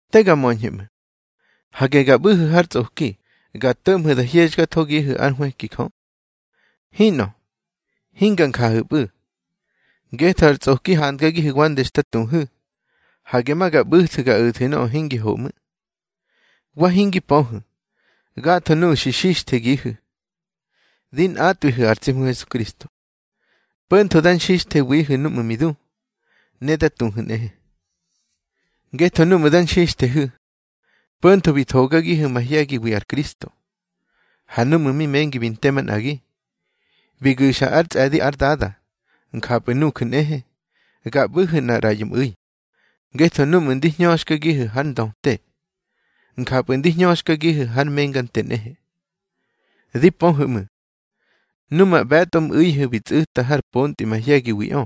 Te ga möñhu̱ ꞌmu̱. Hage ga ꞌbu̱hu̱ har tsꞌoki, ga to̱ꞌmhu̱ da hyexkathogihu̱ ár nhwëki Jö. Hinꞌö, hinga njahu̱pꞌu̱. Ngetho ar tsꞌoki handgagihu̱ wande xta tuhu̱, hage ma ga ꞌbu̱thu̱ ga o̱thu̱ nöꞌö hingi ho ꞌmu̱. Wa hingi pöhu̱, gatho nuꞌu̱ xi xixthegihu̱, di nꞌatꞌwihu̱ ar tsi Hmu Hesukristo. Po̱ntho da nxixthewihu̱ núꞌmu̱ mi du, ne da tuhu̱ nꞌehe. Ngetho núꞌmu̱ da nxixthehu̱, po̱ntho bi thogagihu̱ mahye̱giwi ar Kristo. Ha núꞌmu̱ mi mengi bi nte manꞌagi, bi gu̱xa ár tsꞌe̱di ár Dada, njapꞌu̱ nuju̱ nꞌehe, ga ꞌbu̱hu̱ nꞌar ꞌraꞌyo mꞌu̱i. Ngetho núꞌmu̱ ndi hñöxkagihu̱ hár ndöte, njapꞌu̱ ndi hñöxkagihu̱ hár menga nte nꞌehe. Di pöhu̱ ꞌmu̱, numa ꞌbe̱tꞌo mꞌu̱ihu̱ bi tsꞌu̱ta har pontꞌi mahye̱giwiꞌö.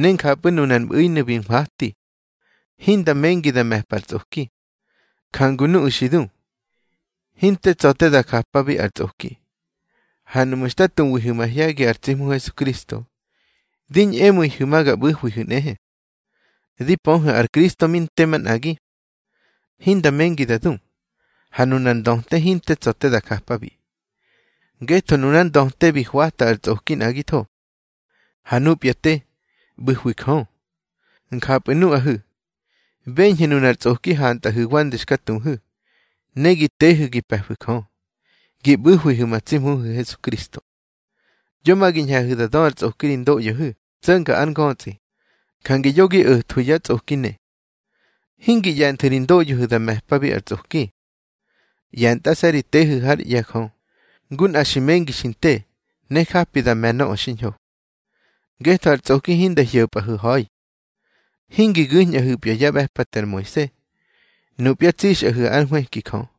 Ne njapꞌu̱ nunar mꞌu̱inu̱ bi nhwati, hinda mengi da me̱pa ar tsꞌoki. Jangu nuꞌu̱ xi du, hinte tsa̱ te da japabi ar tsꞌoki. Ha nuꞌmu̱ xta tuwihu̱ mahye̱gi ar tsi Hmu Hesukristo, di ñꞌemu̱ihu̱ ma ga ꞌbu̱hwihu̱ nꞌehe. Di pöhu̱, ar Kristo mi nte manꞌagi, hinda mengi da du. Ha nunar ndöte hinte tsa̱ te da japabi. Ngetho nunár ndöte bi hwata ar tsꞌoki nꞌagitho. Ha nupya te, ꞌbu̱hwi Jö. Njapꞌu̱ nuꞌahu̱, beñhu̱ nunar tsꞌoki hantꞌaꞌihu̱ wande xka tuhu̱. Ne gi tehu̱ gi pe̱fu̱ Jö, gi ꞌbu̱hwihu̱ ma tsi Hmuhu̱ Hesukristo. Yo ma gi ñhe̱hu̱ da dö ar tsꞌoki ri ndoꞌyohu̱ tso̱nga ár ngötsꞌi. Jange yo gi o̱thwu̱ ya tsꞌoki ne. Hingi ꞌye̱nthu̱ ri ndoꞌyohu̱ da me̱pabi ar tsꞌoki. ꞌYe̱ntꞌase̱ ri tehu̱ hár ꞌye̱ Jö, ngu nꞌa xi mengi xi nte, ne japi da me̱ nöꞌö xiñho. Ngetho ar tsꞌoki hinda hyo̱pꞌahu̱ ha̱i. Hingi gu̱ñꞌahu̱pya yá ꞌbe̱pate ar Moise. Nupya tsixꞌahu̱ ár nhwëki Jö.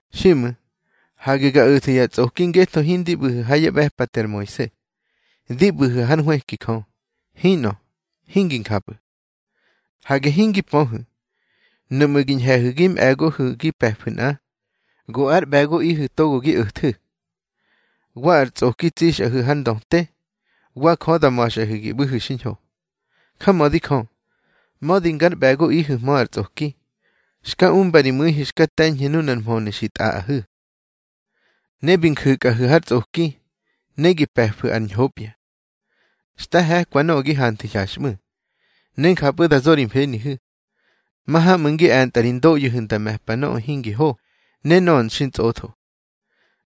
Xiꞌmu̱, hage ga o̱thu̱ ya tsꞌoki ngetho hindi ꞌbu̱hu̱ ha yá ꞌbe̱pate ar Moise, di ꞌbu̱hu̱ hár nhwëki Jö. Hinꞌö, hingi njapꞌu̱. Hage hingi pöhu̱, nuꞌmu̱ gi ñhe̱hu̱ gi mꞌe̱gohu̱ gi pe̱fu̱ nꞌa, go ár ꞌbe̱goꞌihu̱ togo gi o̱thu̱. Wa ar tsꞌoki tsixꞌahu̱ har ndöte, wa Jö da ma̱xꞌahu̱ gi ꞌbu̱hu̱ xiñho. Jamödi Jö, mödi ngar ꞌbe̱goꞌihu̱hmö ar tsꞌoki, xka umba ri mu̱ihu̱ xka te̱ñhu̱ nunar mhönu̱ xi tꞌaꞌahu̱. Ne bi nju̱kꞌahu̱ har tsꞌoki, ne gi pe̱fu̱ ar ñhopya. Xta he̱kwa nöꞌö gi hanthu̱ hyaxꞌmu̱, ne njapꞌu̱ da zo ri mfenihu̱. Mahamꞌu̱ ngi e̱ntꞌa ri ndoꞌyohu̱ nda me̱pa nöꞌö hingi ho ne nöꞌö xintsꞌotho.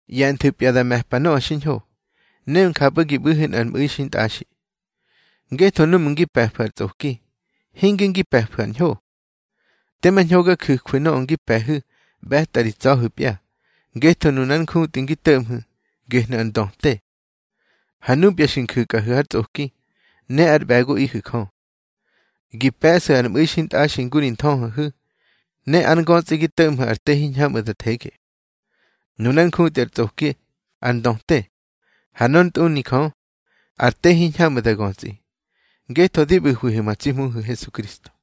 ꞌYe̱nthu̱pya da me̱pa nöꞌö xiñho, ne njapꞌu̱ gi ꞌbu̱hu̱ nꞌar mꞌu̱i xintꞌaxi. Ngetho núꞌmu̱ ngi pe̱fu̱ ar tsꞌoki, hinge ngi pe̱fu̱ ar ñho. Tema ñho ga ju̱jwu̱ nöꞌö ngi pe̱hu̱ ꞌbe̱tꞌa ri tsa̱hu̱pya. Ngetho nunar njutꞌi ngi to̱ꞌmhu̱, gehnu̱ ar ndöte. Ha nupya xi nju̱kꞌahu̱ har tsꞌoki, ne ár ꞌbe̱goꞌihu̱ Jö, gi pe̱ꞌsu̱ ar mꞌu̱i xintꞌaxi ngu ri nthöhöhu̱. Ne ár ngötsꞌi gi to̱ꞌmhu̱ ar te hiñhamꞌu̱ da thege. Nunár njutꞌi ar tsꞌoki, ar ndöte. Ha nor ntꞌuni Jö, ar te hiñhamꞌu̱ da götsꞌi, ngetho di ꞌbu̱hwihu̱ ma tsi Hmuhu̱ Hesukristo.